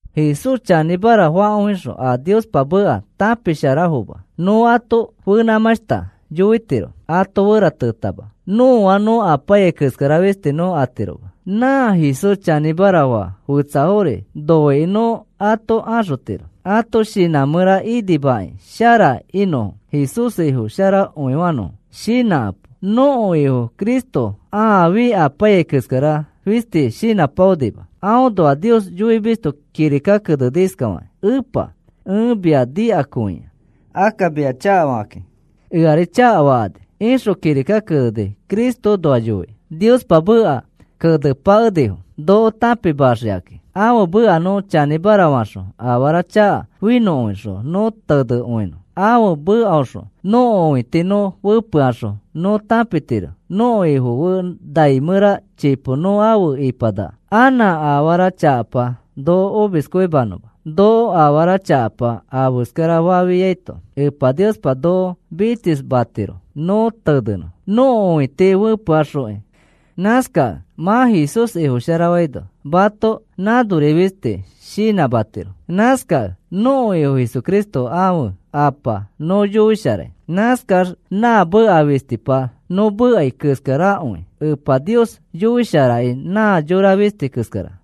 Jesús chanĩmara fakõixõ a Niospa meka tãpisharafoma nõ ato fenãmãshta yoitiro ato fe feratenãtama. Nõa nõ apaiyai keskara fisti nõ atiroma. Nã Jesús chanĩmara faa fetsafori noikĩ nõ ato axotiro ãto shinã mẽra inimamakĩ shara inõfo Jesús Ifo sharafakõinõfo. Shinãkapo. Nõko Ifo Cristo aafi apaiyai keskara fisti shinãpaonima. Aõnoa Nios yoimisto kirika keneni iskafakĩ: “Epa, ẽ mia nikakõia. Akka mia chakafakakĩ eari chakafakani,” ixõ kirika keneni Cristoõnoa yoikĩ. Niospa meka kenepakenifo noko tãpimaxikakĩ. Ãfe meka nõ chanĩmara faxõ afara chaka finõkõixõ nõ tenekõinõ. Ãfe mekaõxõ nõko õiti nõ fepeaxõ nõ tãpitiro nõko Ifo fe nai mẽra chipo nõ afe ipanaka anã afara chakapa noko omiskõimanõma. Noko afara chakapa afeskarafafiaito Epa Niospa noko mitsisfamatiro nõ tenenõ nõko õiti fepeaxokĩ. Nãskakẽ mã Jesús Ifofasharaino mato nãnori fisti shinãmatiro. Nãskakẽ nõko Ifo Jesucristo ãfe Apa nõ yoisharai. Nãskax nã meka fistipa nõ mekai keskarakõi Epa Nios yoisharakĩ nã yora fisti keskara.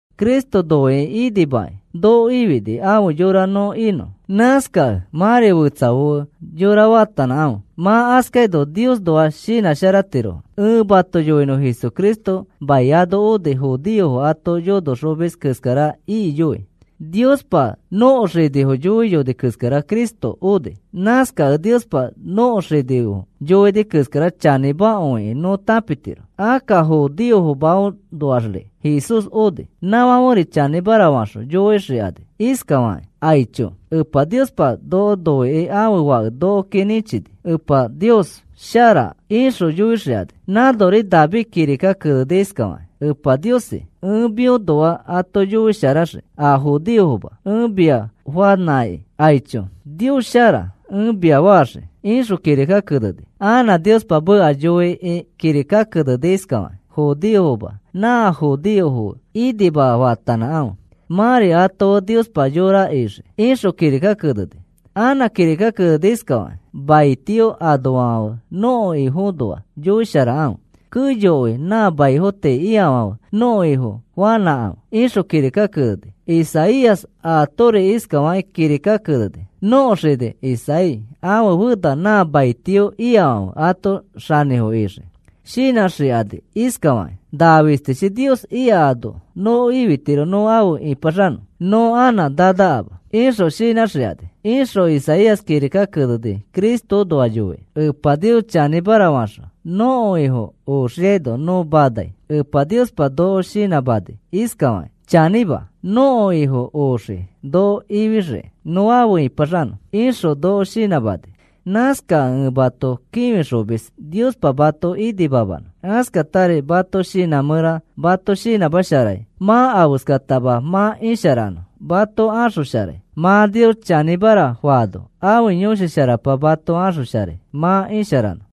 Cristo nokoki inimakĩ noko ifini afe yorafo nõ inõ. Nãskakẽ mãri fetsafo fe yõra faatanãkãfe. Mã askaino Niosnoa shinãsharatirofo. Ẽ mato yoinõ Jesucristo mai ano oni judeofo ato yonoxomis keskara ikiyoi. Niospa nõko xinifo yoiyoni keskara Cristo oni. Nãskakẽ Niospa nõko xinifo yoini keskara chanĩmakõikẽ nõ tãpitiro. Akka judeofomaõnoaxri Jesús oni. Nãfãferi chanĩmara faxõ yoixikani iskafakakĩ: “Aicho, Epa Niospa noko noikĩ ãfe Fake nokoki nĩchini. Epa Nios shara,” ixõ yoixikani. Nãnori David kirika keneni iskafakĩ: Epa Niosi, ẽ mĩõnoa ato yoisharaxii, a judeofoma. Ẽ mia fanãki, “Aicho, Nios shara,” ẽ mia faxii, ixõ kirika keneni. Anã Niospa meka yoikĩ kirika keneni iskafakĩ: Judeofoma nã judeofo fe inima faatanãkãfe. Mãri ato fe Niospa yora ixii, ixõ kirika keneni. Anã kirika keneni iskafakĩ: Maitio anoafãfe, nõko Ifoõnoa yoisharakãfe. Keyokõi nã maifo tii ikafãfe nõko Ifo fanãkãfe, ixõ kirika keneni. Isaías aatori iskafakĩ kirika keneni: Nõko xini Isaí ãfe fena na maitio ikafãfe ãto xanĩfo ixii. Shinãxikani iskafakakĩ: “Nã fistichi Nios ika ano noko ifitiro nõ afe ĩpaxanõ, nõ anã nanakama,” ixõ shinãxikani, ixõ Isaías kirika keneni Cristoõnoa yoikĩ. Epa Nios chanĩmara faxõ nõko Ifo oxiaino nõ manai. Epa Niospa noko shinãmani iskafakĩ: “Chanĩma, nõko Ifo oxii noko ifixiki nõ afe ĩpaxanõ,” ixõ noko shinãmani. Nãskakẽ ẽ mato kĩfixomis Niospa mato inimamanõ. Askatari mãto shinã mẽra mato shinãmasharai mã afeskatama mã isharanõ mato axosharai. Mã Nios chanĩmara faano ãfe Yõshi Sharapa mato axosharai mã isharanõ.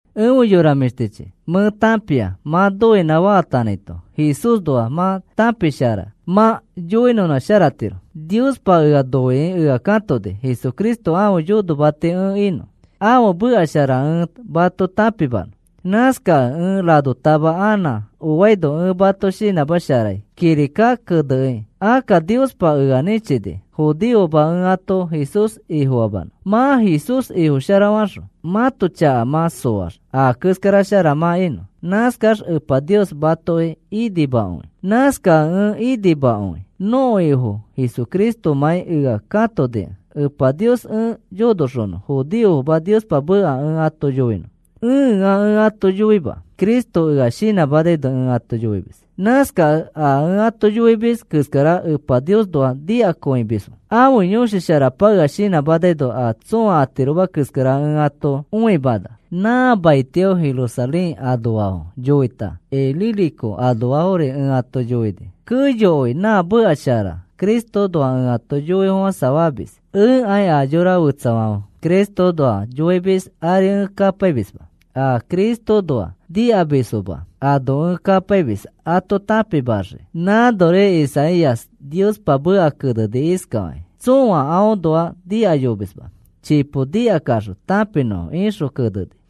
Efe yora mĩshtichi, mẽ tãpia mã noinã faatanãito Jesúsnoa mã tãpisharai mã yoinõnãsharatiro. Niospa ea noikĩ ea katoni Jesucristo ãfe yonomati ẽ inõ, ãfe meka shara ẽ mato tãpimanõ. Nãskakẽ ẽ ranotama anã aõnoa ẽ mato shinãmasharai kirika kenekĩ. Akka Niospa ea nĩchini judeofoma ẽ ato Jesús Ifofamanõ. Mã Jesús Ifo sharafaxõ, mãto chaka mã soax a keskara shara mã inõ. Nãskax Epa Nios matoki inimakõi. Nãskakẽ ẽ inimakõi nõko Ifo Jesucristomãi ea katonikẽ Epa Nios ẽ yonoxonõ judeofoma Niospa meka ẽ ato yoinõ. Ẽa ẽ ato yoima. Cristo ea shinãmanaino ẽ ato yoimis. Nãskakẽ a ẽ ato yoimis keskara Epa Niosnoa nikakõimisfo. Ãfe Yõshi Sharapa ea shinãmanaino a tsõa atiroma keskara ẽ ato õimana. Nã maitio Jerusalén anoafo yoita Ilírico anoafori ẽ ato yoini. Keyokõi nã meka shara Cristoõnoa ẽ ato yoifofãsafamis. Ẽkai a yora fetsafãfe Cristoõnoa yoimisfo ari ẽ kapaimisma. A Cristoõnoa nikamisfoma ano ẽ kapaimis ato tãpimaxiki. Nãnori Isaías Niospa meka keneni iskafakĩ: Tsõa aõnoa nikayomisma chipo nikakaxõ tãpinõfo, ixõ keneni.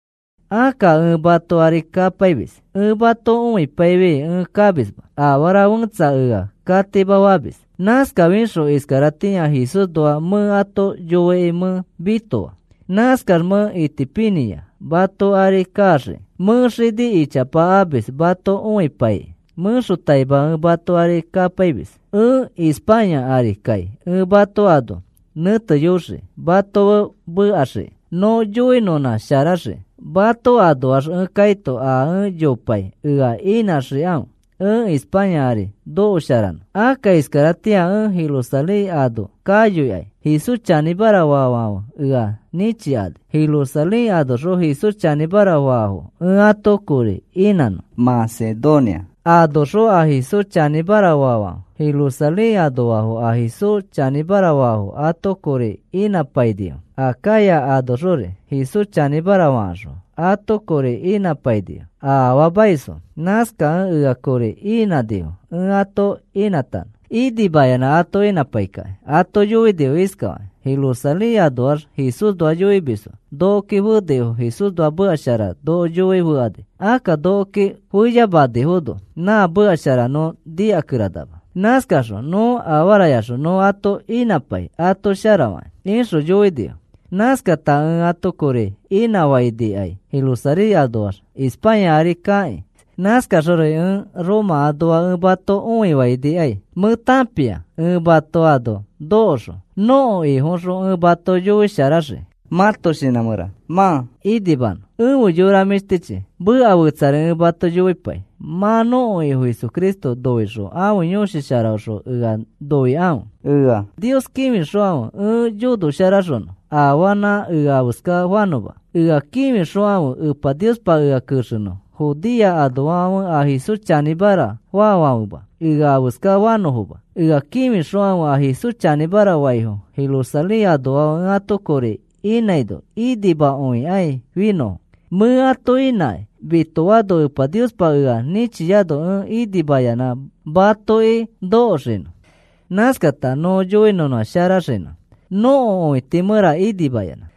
Akka ẽ mato ari kapaimis. Ẽ mato õikapaifi ẽ kamisma. Afara fẽtsa ea katimafamis. Nãskafixõ iskaratĩa Jesúsnoa mẽ ato yoikĩ mẽ mitoa. Nãskax mẽ itipinĩa mato ari kaxiki. Mẽ xini ichapa amis mato õikapaikĩ. Mẽxotaima ẽ mato ari kapaimis. Ẽ España ari kai ẽ mato ano nẽteyoxii mato fe mekaxiki nõ yoinõnãsharaxiki. Mato anoax ẽ kaito a ẽ yopai ea inãxikãfe ẽ España ari nokosharanõ. Akka iskaratĩa ẽ Jerusalén ano kayoikai. Jesús chanĩmara faafãfe ea nĩchikani a Jerusalén anoxõ Jesús chanĩmara faafo ẽ ato kori inãnõ. Macedonia anoxõ a Jesús chanĩmara faafãfe Jerusalén anoafo a Jesús chanĩmara faafo ato kori inãpainifo. Acaya anoxori Jesús chanĩmara fakaxõ ato kori inãpainifo a afaamaisfo. Nãskakẽ ea kori inãnifo ẽ ato inãtanõ. Inimayanã ato inãpaikakĩ ato yoinifo iskafakakĩ: “Jerusalén anoax Jesúsnoa yoimisfo nokoki fenifo Jesúsnoa meka shara noko yoi fekani. Akka nokoki feyamanifono na meka shara nõ nikakeranama. Nãskaxõ nõ afarayaxõ nõ ato inãpai ato sharafakĩ,” ixõ yoinifo. Nãskata ẽ ato kori inãfainikai Jerusalén anoax España ari kakĩ. Nãskaxori ẽ Roma anoa ẽ mato õifainikai. Mẽ tãpia ẽ mato ano nokoxõ nõko Ifoxõ ẽ mato yoisharaxii mãto shinã mẽra mã inimanõ. Efe yora mĩshtichi, meka fetsari ẽ mato yoipai. Mã nõko Ifo Jesucristo noixõ ãfe Yõshi Sharaõxõ ea noikãfe. Ea Nios kĩfixokãfe ẽ yonosharaxonõ afanã ea afeska fanõma. Ea kĩfixokãfe Epa Niospa ea kexenõ Judea anoafãfe a Jesús chanĩmara faafãfema ea afeska fanõfoma. Ea kĩfixokãfe a Jesús chanĩmara faifo Jerusalén anoafo ẽ ato kori inãino inimakõikai finõfo. Mẽ ato inãkĩ mitoano Epa Niospa ea nĩchiano ẽ inimayanã matoki nokoxinõ. Nãskata nõ yoinõnãsharaxinõ nõko õiti mẽra inimayanã.